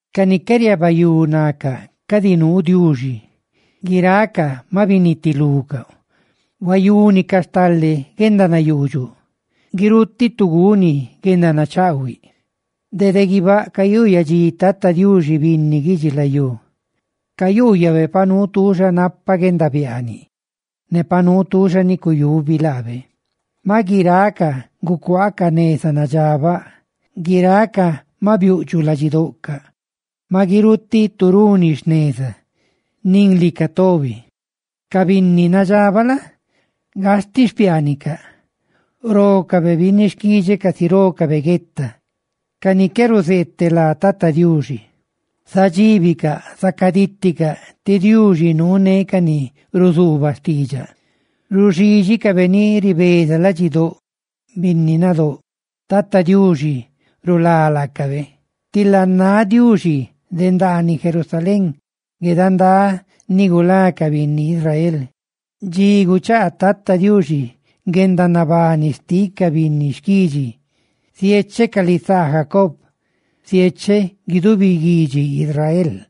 Ca ni qué riabayú nacaꞌ cadi nuu Diuxi; guiracaꞌ maꞌ binitilucaꞌ; huayúnicaꞌ stale guendanayuudxuꞌ; ¡guirutiꞌ tu guni guendanachaꞌhuiꞌ! Dede guibáꞌ cayuyadxi Tata Diuxi binni guidxilayú cayuuyabe pa nuu tuuxa napa guendabiaaniꞌ, ne pa nuu tuuxa ni cuyubi laabe. Maꞌ guiracaꞌ gucuaacaꞌ neza nadxabaꞌ; guiracaꞌ maꞌ biuꞌdxuꞌ ladxidoꞌcaꞌ. ¡Maꞌ guirutiꞌ tu runi jneza! ¡Nin lica tobi! Ca binni nadxabaꞌ la? gastiꞌ xpiaanicaꞌ, rócabe binni xquidxeꞌ casi rócabe gueta, ca ni qué ruzeeteꞌ lá Tata Diuxi. Zadxíbicaꞌ, zacadíticaꞌ, tí Diuxi nuuné ca ni ruzuubaꞌ xtiidxaꞌ. Ruxídxicabe ni ribeza ladxidóꞌ binni nadóꞌ; Tata Diuxi rulá laacabe. ¡Tila náꞌ Diuxi de dani Sión guedandá ni gulá ca binni Israel! Dxi guchaa Tata Diuxi guendanabani xtiꞌ ca binni xquidxi, ziecheꞌ ca lisaa Jacob, ziecheꞌ guidubi guidxi Israel.